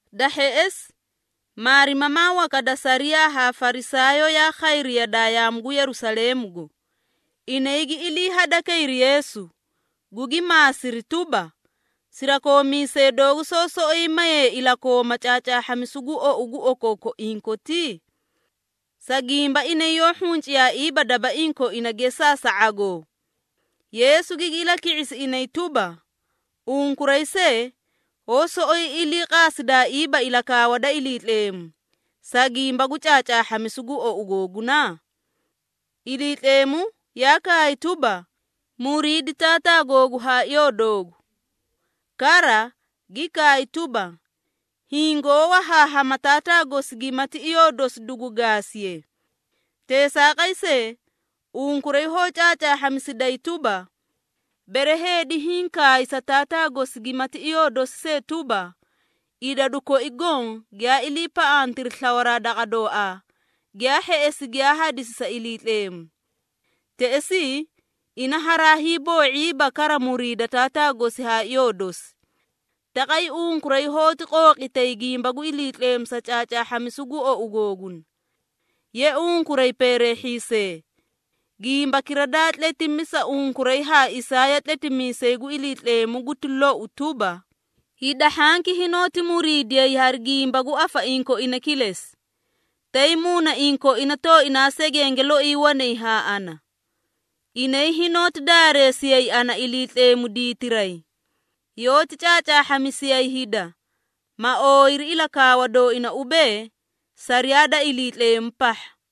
Da hheꞌesi, maarimamaa waka da sariyaa haa Farisaayoo yaa khayri yadaa yaamu gu Yerusaleemugo, inay gi ilii hadakayri Yeesu, gugi maasiri tuba, “Sirakoomiisee doogu soó soꞌoyi mayay ilakooma caacaahhamisu gu ou gu okookoiĩ koti? Sa gimba inay yoó hhunciyaaiiba dabaiĩ koina gesaa sa ⁄agoo!” Yeesu gigi ilaki⁄isi inay tuba, “Unkuray see, hoó soꞌoyi iliiqaasidaaiiba ilakaawa da Iliitleemu, sa gimba gu caacaahhamisu gu ou googuna? Iliitleemu yaa kaay tuba, ‘Muriidi taataa googu haa iyoo doogu.’ Kara, gi kaay tuba, ‘Hiĩ goó wahaahama taataa gosi gimati iyoo dosi dugu gaasiye.’ Teesaaqay see, unkuray hoó caacaahhamisiday tuba, bere heedi hiĩ kaay sa taataa gosi gimati iyoo dosi see tuba, ‘Idadu koi goõ giyaa iliipaꞌantiri slawaraa daqa dooaa, giyaa hheꞌesi giyaa hadisi sa Iliitleemu.’ Teꞌesii ina haraa hiiboo⁄iiba kara muriida taataa gosi haa iyoo dosi. Taqay unkuray hoóti qooqitay gimba gu Iliitleemu sa caacaahhamisu gu ou googuna. Ye, unkuray peereehhiisee! Gimbakira daa tletimi sa unkuray ha Isaaya tletimiisay gu Iliitleemu guti lou tuba, ‘Hida hhanki hinoóti muriidiyay hari gimba gu afaiĩ koina kilesi, tay muunaiĩ koina tooinaa segenge loi wanay haa ana. Inay hinoóti daareesiyay ana Iliitleemu diitiray, yoóti caacaahhamisiyay hida, ma ooyiri ilakaawa dooina ubee, sariyaa da Iliitleemu pahha.’”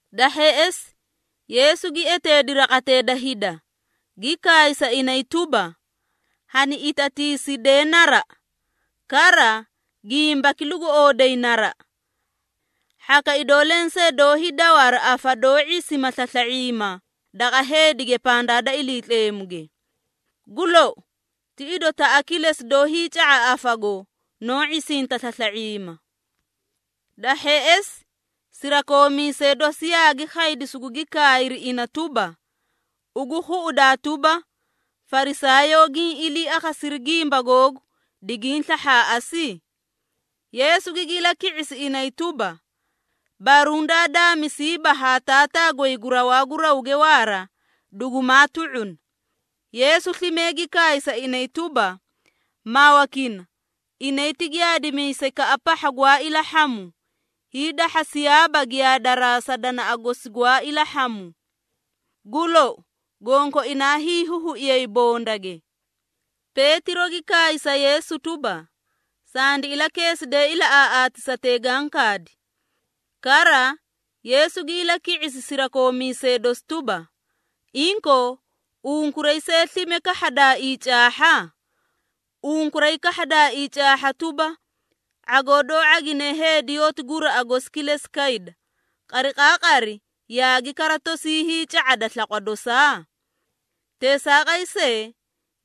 Da hheꞌesi, Yeesu gi eteedi raqatee da hida, gi kaay sa inay tuba, “Hani itatiisidee naraꞌa, kara gimbaki lugu ooday naraꞌa. Hhaka idoo lensee doó hiidawa hari afa doó ⁄isima slasla⁄iima daqa heedige pandaa da Iliitleemuge. Gu lou, ti idotaꞌa kilesi doó hiica⁄a afago, noó ⁄isinta slasla⁄iima.” Da hheꞌesi, sirakoomiisee dosi yaagi khaydi sugugi kaayri ina tuba, “Ugu khuꞌudaa tuba, Farisaayoo giĩ ilii akhasiri gimba googu, digiĩ slahhaaꞌasi?” Yeesu gigi ilaki⁄isi inay tuba, “Baruũ daa daamisiiba ha Taataa goy gu rawaa gu rawge waara, dugumaa tu⁄una.” Yeesu slime gi kaay sa inay tuba, “Mawakini, inay ti giyaadimiisaykaꞌa pahha gwaa ilahhamu, hiidahhasiyaaba giyaadaraa sa danaꞌa gosi gwaa ilahhamu. Gu lou, gonkoinaa hiihuhuiyay bondage.” Peetiro gi kaay sa Yeesu tuba, “Sandi ilakeeside ilaꞌaaꞌaatisatee gaã kaadi.” Kara, Yeesu gi ilaki⁄isi sirakoomiisee dosi tuba, “Inkoo, unkuray see slime kahhadaaii caahha? Unkuray kahhadaaii caahha tuba, ⁄agoo doó ⁄agine heedi yoóti guraꞌa gosi kilesi kayda, qariqaaqari yaagi kara tosii hiica⁄ada slaqwa dosaa? Teesaaqay see,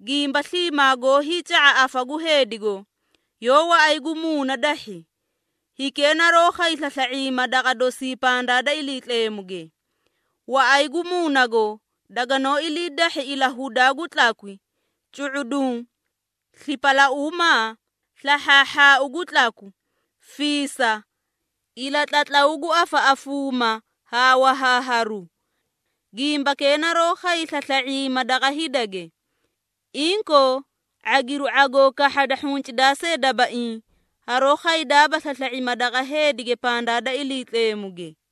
gimba sliimaa goó hiica⁄a afa gu heedigo, yoó waꞌay gu muuna dahhi, hikee naroó khay slasla⁄iima daqa dosii pandaa da Iliitleemuge. Waꞌay gu muunago daganoó ilii dahhi ilahudaa gu tlakwi, cu⁄uduũ, slipalauumaa, slahhaahhaau gu tlaku, fiisa, ilatlatlaw gu afaꞌafuuma haa wahaaharu. Gimbakee naroó khay slasla⁄iima daqa heedige. Inkoo, ⁄agiru ⁄agoo kahhada hhuncidaa see dabaiĩ, haroó khaydaaba slasla⁄iima daqa heedige pandaa da Iliitleemuge.”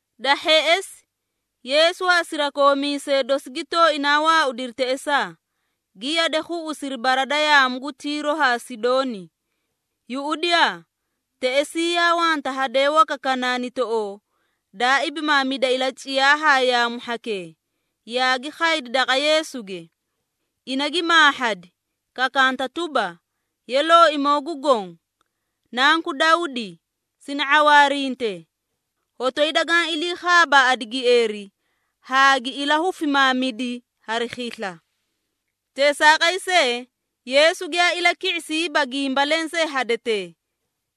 Da hheꞌesi, Yeesu haa sirakoomiisee dosi gi tooinaa waaudiri teꞌesaa, gi yade khuꞌusiri bara da yaamu gu Tiiro haa Sidooni. Yuꞌudiyaa, teꞌesii yaa wanta hadee waka Kanaanitoꞌoo, daa ibimaamida ilaciyaa haa yaamu hhakee, yaagi khaydi daqa Yeesuge. Ina gi maahhadi, kakanta tuba, “Ye Looimoo gu Goõ, Nanku Dawdi, sini ⁄awaarinte! Hotoyi dagaã ilii khaabaaꞌadi gieeri haa gi ilahufimaamidi hari khisla.” Teesaaqay see, Yeesu giyaa ilaki⁄isiiba gimba lensee hadetee.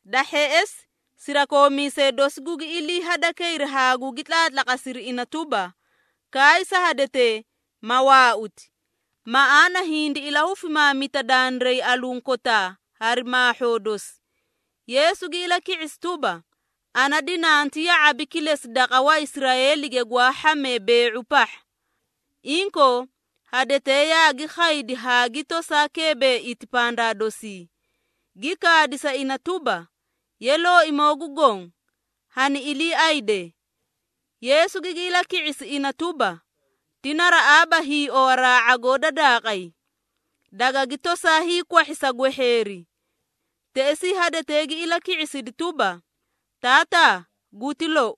Da hheꞌesi, sirakoomiisee dosi gugi ilii hadakayri haa gugi tlaatlaqasiri ina tuba, “Kaay sa hadetee, ma waauti, maꞌaana hindi ilahufimaamita dandiray alunkotaa hari maahhoo dosi.” Yeesu gi ilaki⁄isi tuba, “Ana dinanti ya⁄abi kilesi daqa Waisraeeli gwaa hhamee bee⁄u pahha.” Inkoo, hadetee yaagi khaydi haa gi tosaa keebeeiti pandaa dosii, gi kaadi sa ina tuba, “Ye, Looimoo gu Goõ, hani iliiayde!” Yeesu gigi ilaki⁄isi ina tuba, “Ti naraꞌaaba hiiowaraa ⁄agoo da daaqay, dagagi tosaa hiikwahhi sa gwehheeri.” Teꞌesii hadetee gi ilaki⁄isidi tuba, “Taataa, guti lou!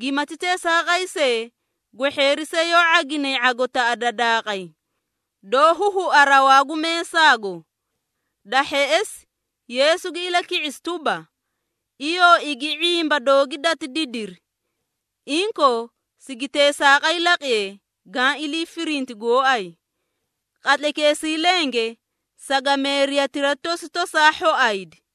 Gimati teesaaqay see, gwehheeri see yoó ⁄aginay ⁄agotaꞌa da daaqay, doó huhua rawaa gu meesaago.” Da hheꞌesi, Yeesu gi ilaki⁄isi tuba, “Iyoo igi ⁄imba doogi dati didiri! Inkoo, sigi teesaaqay laqiye gaã ilii firinti gooay.” Qatlaykeesii lenge, sagameeriyatira tosi tosaa hhoaydi.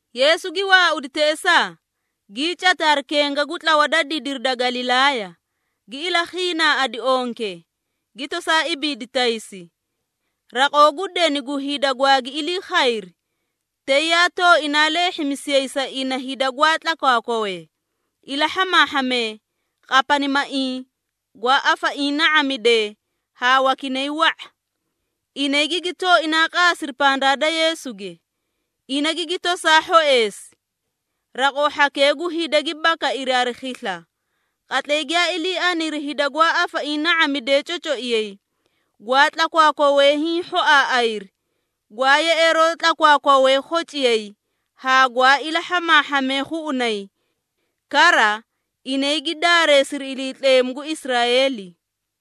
Yeesu gi waaudi teꞌesaa, gii cati hari kenga gu tlawa da didiri da Galilaaya, gi ilakhiinaaꞌadi onke, gi tosaa ibiidi taysi. Raqoo gu deni gu hida gwaagi ilii khayri, tay yaa tooinaa leehhimisiyay sa ina hida gwaa tlakwaakwawee, ilahhamaahhamee, qapanimaiĩ, gwaa afaiĩ na⁄amidee haa wakinay wa⁄a. Inay gigi tooinaa qaasiri pandaa da Yeesuge, ina gigi tosaa hhoeesi. Raqoo hhakee gu hida gi bakairi hari khisla, qatlay giyaa ilii aniri hida gwaa afaiĩ na⁄amidee cocoiyay, gwaa tlakwaakwawee hiĩ hhoaaꞌayri, gwaa yeꞌeeroo tlakwaakwawee khociyay haa gwaa ilahhamaahhamee khuꞌunay. Kara, inay gi daareesiri Iliitleemu gu Israeeli.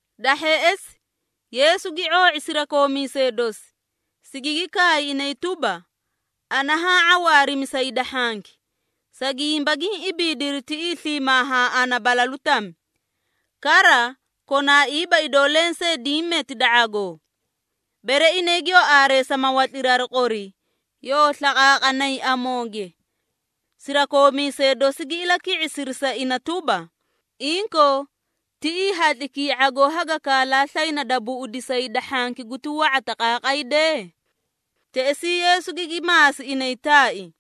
Da hheꞌesi, Yeesu gi ⁄oo⁄i sirakoomiisee dosi, sigigi kaay inay tuba, “Ana haã ⁄awaarimi sa hida hhanki, sa gimba giĩ ibiidiri tiꞌii sliimaa haa ana balalu tami, kara konaaiiba idoo lensee diĩ meti da ⁄agoo. Bere inay giyoo aareesa, ma watliri hari qori, yoo slaqaaqanay amooge.” Sirakoomiisee dosi gi ilaki⁄isiri sa ina tuba, “Inkoo, tiꞌii hatlikii ⁄agoo haga kaalaa slayna da buꞌudisa hida hhanki guti wa⁄a taqaaqay dee?” Teꞌesii Yeesu gigi maasi inay taai,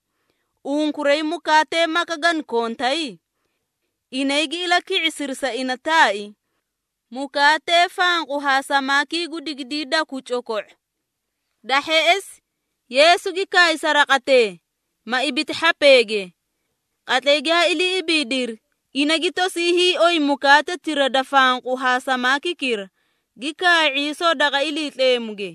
“Unkuray mukaatee maka gana kontay?” Inay gi ilaki⁄isiri sa ina taai, “Mukaatee fanqu haa samaakii gu digidiidaku coko⁄o.” Da hheꞌesi, Yeesu gi kaay sa raqatee, ma ibiti hhapeege. Qatlay giyaa ilii ibiidiri, ina gi tosii hiioy mukaatetira da fanqu haa samaakikira, gi kaay ⁄iisoo daqa Iliitleemuge.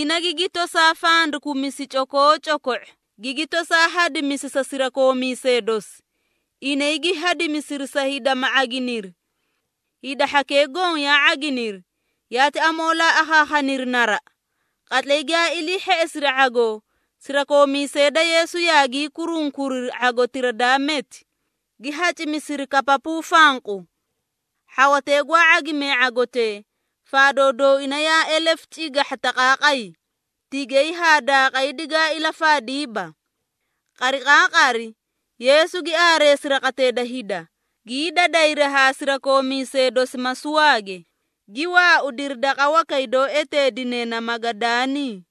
Ina, gigi tosaa fandakumisi cokoocoko⁄o, gigi tosaa hadimisi sa sirakoomiisee dosi, inay gi hadimisiri sa hida ma ⁄aginiri. Hida hhakee goõ yaa ⁄aginiri, yaati amoolaa akhaakhaniri naraꞌa. Qatlay giyaa ilii hheꞌesiri ⁄agoo, sirakoomiisee da Yeesu yaagii kurunkuriri ⁄agotira daa meti, gi hacimisiri kapapuu fanqu. Hhawatee gwaa ⁄agimee ⁄agotee, faadoo dooina yaa elefu cigahha taqaaqay, tigay haa daaqay digaa ilafaadiiba. Qariqaaqari, Yeesu gi aareesi raqatee da hida, gii dadayri haa sirakoomiisee dosi masuwaage, gi waaudiri daqa wakay doó eteedine na Magadaanii.